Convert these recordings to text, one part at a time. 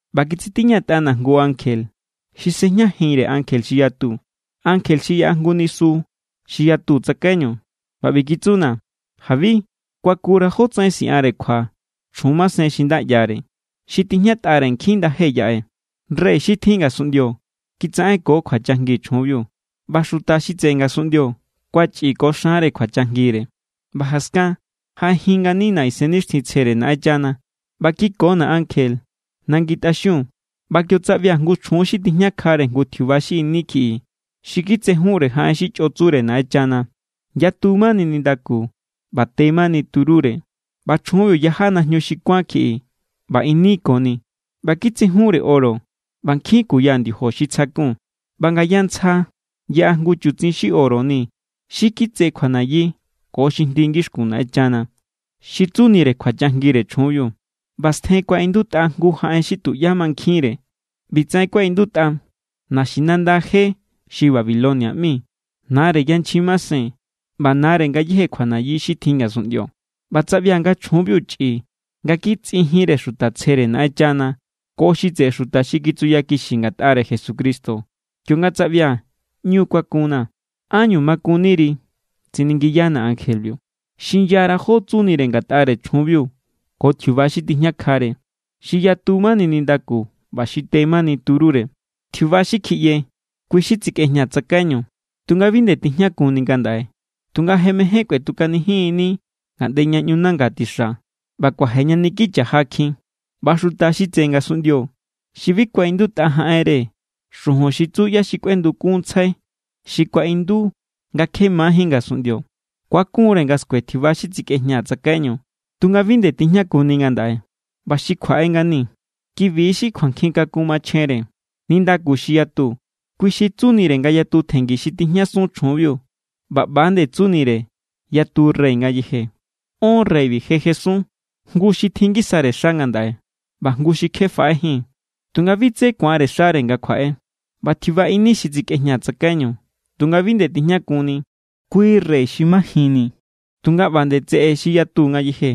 ꞌBa kitsitiñatꞌana̱ jngu ankje xi sꞌejñajinre ankje xi yatu, ankje xi yaꞌa jngu nisu xi yatu tsakaiñu. ꞌBa ꞌbi kitsuna̱: “Jabi. Kuakura̱ jótsaꞌen siꞌanre kjua chjun masen xi nda ꞌyare, xi tijñatꞌare nkjin ndaje yaꞌe. Rey xi tjin ngasunꞌndio kitsaꞌenko kjuachajngi chjunbiu, ꞌba xuta xi tseꞌe ngasunꞌndio kuachꞌi ko xanre kjuachajngire.” ꞌBa jaskan jaꞌejin nganina̱ Isennixtjintsjere Naꞌenchana ꞌba kikona̱ ankje nangi tꞌaxiun. ꞌBa kio tsaꞌbia̱ jngu chjun xi tijñakjare jngu tjiuba xi ini kjiꞌi xi kitsejunre jaꞌen xi chꞌo tsure Naꞌenchana. Yatu= mani nindaku ꞌba te mani turúre. ꞌBa chjunbiu yaja najñu xi kuán kjiꞌi ꞌba ini koni, ꞌba kitsejunre oro ꞌba nkjin kuya ndiojo xi tsjakun. ꞌBa ngaya ntsja yaꞌa jngu chutsin xi oro ni xi kitse kjuanayi ko xi jndi ngixkun Naꞌenchana, xi tsunire kjuachajngire chjunbiu. ꞌBa stjen kuaꞌindutꞌa jngu jaꞌen xi tuꞌyá mankjinre. ꞌBi tsaꞌen kuaꞌindutꞌa: “Naxinanda je xi Babilonia ꞌmi, nare yanchjin masen ꞌba nare ngayéje kjuanayi xi tjin ngasunꞌndio.” ꞌBa tsaꞌbia̱ nga chjunbiu chꞌi nga kitsꞌi jinre xuta tsjere Naꞌenchana ko xi tseꞌe xuta xi kitsuyakixi ngatꞌare Jesucristo. Kionga tsaꞌbia̱, ꞌñu kuakunna̱. “¿Ánñu makunniri?”, tsiningiyana̱ ankjebiu. “Xinyara̱ jó tsunire ngatꞌare chjunbiu ko tjiuba xi tijñakjare, xi yatu mani nindaku ꞌba xi te mani turúre. Tjiuba xi kjiꞌye, kui xi tsikꞌejña tsakaiñu tunga bi nde tijñakunni ngandaꞌe. Tunga je mején kꞌuetukanijin=ni ngaꞌnde ña ꞌñu nanga tixa ꞌba kuaje ña niki cha̱jakjin. ꞌBa xuta xi tseꞌe ngasunꞌndio, xi bi kuaꞌindutꞌa jaꞌenre xujun xi tsu ꞌyá= xi kꞌuendukunntsjai xi kuaꞌindu nga kje majín ngasunꞌndio, ku̱akun=re nga skue tjiuba xi tsikꞌejña tsakaiñu tunga bi nde tijñakunni ngandaꞌe ꞌba xi kjuaꞌe ngani. ’Kibi= xi kjuankjin kakun machjenre. Nindaku xi yatu, kui xi tsunire nga yatu tjengi xi tijñasun chjunbiu ꞌba ꞌba=nde tsunire yatu rey ngayeje. Ón reybi je jesun, jngu xi tjin ngisare xa ngandaꞌe, ꞌba jngu xi kje faꞌejín, tunga bi tse ku̱anre xare nga kjuaꞌe. ꞌBa tjiuba ini xi tsikꞌejña tsakaiñu tunga bi nde tijñakunni, kui rey xi majinni, tunga ꞌba nde tseꞌe xi yatu ngayeje.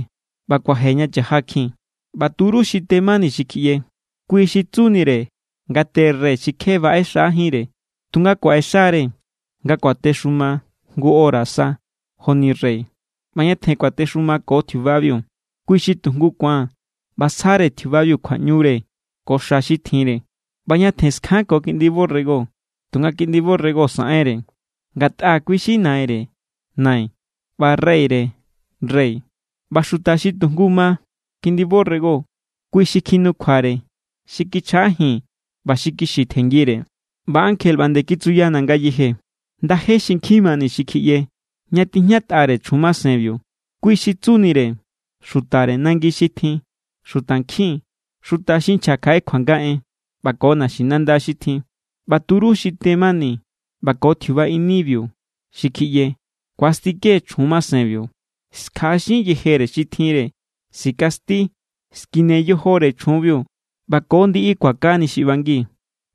ꞌBa kuaje ña cha̱jakjin. ’ꞌBa turú xi te mani xi kjiꞌye, kui xi tsunire nga te rey xi kje baꞌe xajínre. Tunga kuaꞌexa=re nga kuatexuma jngu hora sa joni rey ꞌba ñatjen kuatexumako tjiubabiu. Kui xi tujngu ku̱an ꞌba sjare tjiubabiu kjuaꞌñure ko xa xi tjinre. ꞌBa ñatjen skjanko Kiꞌndi borrego, tunga Kiꞌndi borrego saꞌenre, ngatꞌa kui= xi Naire nai ꞌba Reyre rey. ꞌBa xuta xi tujngu ma Kiꞌndi borrego, kui= xi kjinukjuare, xi kichjaꞌajin ꞌba xi kixi tjenngire.” ꞌBa ankje ꞌba nde kitsuyana̱ ngayeje: “Ndaje xi nkjin mani xi kjiꞌye, ña tijñatꞌare chjun masenbiu, kui xi tsunire xutare nangi xi tjin, xutankjin, xuta xi nchja kjaꞌe kjuanga en, ꞌba ko naxinanda xi tjin. ꞌBa turú xi te mani ꞌba ko tjiuba inibiu xi kjiꞌye ku̱astike chjun masenbiu. Skjaꞌaxin yejere xi tjinre, sikasti, skine yojore chjunbiu, ꞌba ko ndiꞌi kuakani xi ꞌbangi.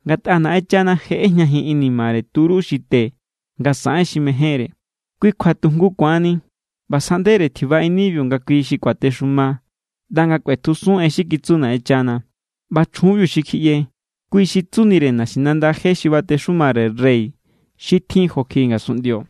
Ngatꞌa Naꞌenchana je ꞌejñajin inimare turú xi te nga saꞌen xi mejénre. Kui kjua tu jngu ku̱anni ꞌba sjaꞌndere tjiuba inibiu nga kui xi kuatexuma ꞌnda nga kꞌuetjusun en xi kitsu Naꞌenchana. ꞌBa chjunbiu xi kjiꞌye, kui xi tsunire naxinanda je xi batexumare rey xi tjin jo kjiꞌi ngasunꞌndio.”